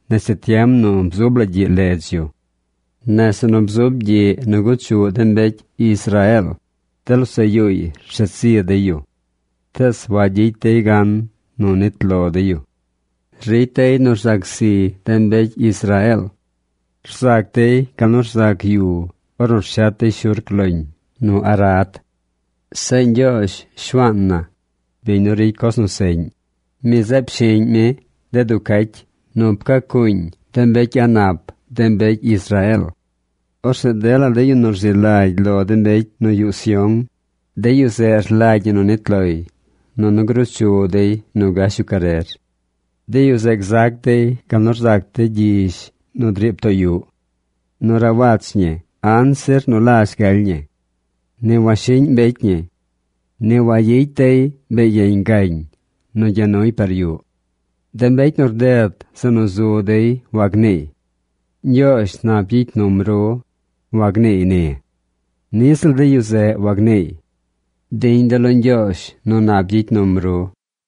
nese tiem nu bzub la gyiꞌ ledz yu. Nese nu bzub gyiꞌ nu guchuꞌ de mbecy Israeel, de losaꞌ yuuy rshet zi dey yu. Tees wagyicy dey gan nu nnit lo dey yu. Ricy dey nu rzac zi de mbecy Israeel. Rzac dey gal nu rzac yu ornu rshet dey shurc loñ nu arad. Zeꞌ Ñgyoozh, Shuaan na, biñ nu ricy coz nu seꞌñ, mi zeꞌ pshiꞌñ mi de duu cacy nu pcaa cuuñ de mbecy a̱ꞌ nap de mbecy Israeel. Orzeꞌ dela de yu nu rzi lagy lo de mbecy nu yuꞌ Sión, de yu zeꞌ rlagy ñi nu nit loy, nunu gruu chu dey nu gash yu carer. De yu zeꞌ gzac dey gal nu rzac de gyizh nu driib too yuꞌ. Nu rawach ñi anzir nu lazh galy ñi. Ni washiꞌñ mbecy ñi. Ni wayicy dey be yeñ gañ nu gya nuy par yuꞌ. De mbecy nu rded zeꞌ nu zu dey wagniiy: “Ñgyoozh nap gyicy num ru”, wagniiy ni. Niꞌ ziꞌl de yu zeꞌ wagniiy: “Diñ de̱ lo Ñgyoozh nu nap gyicy num ru.”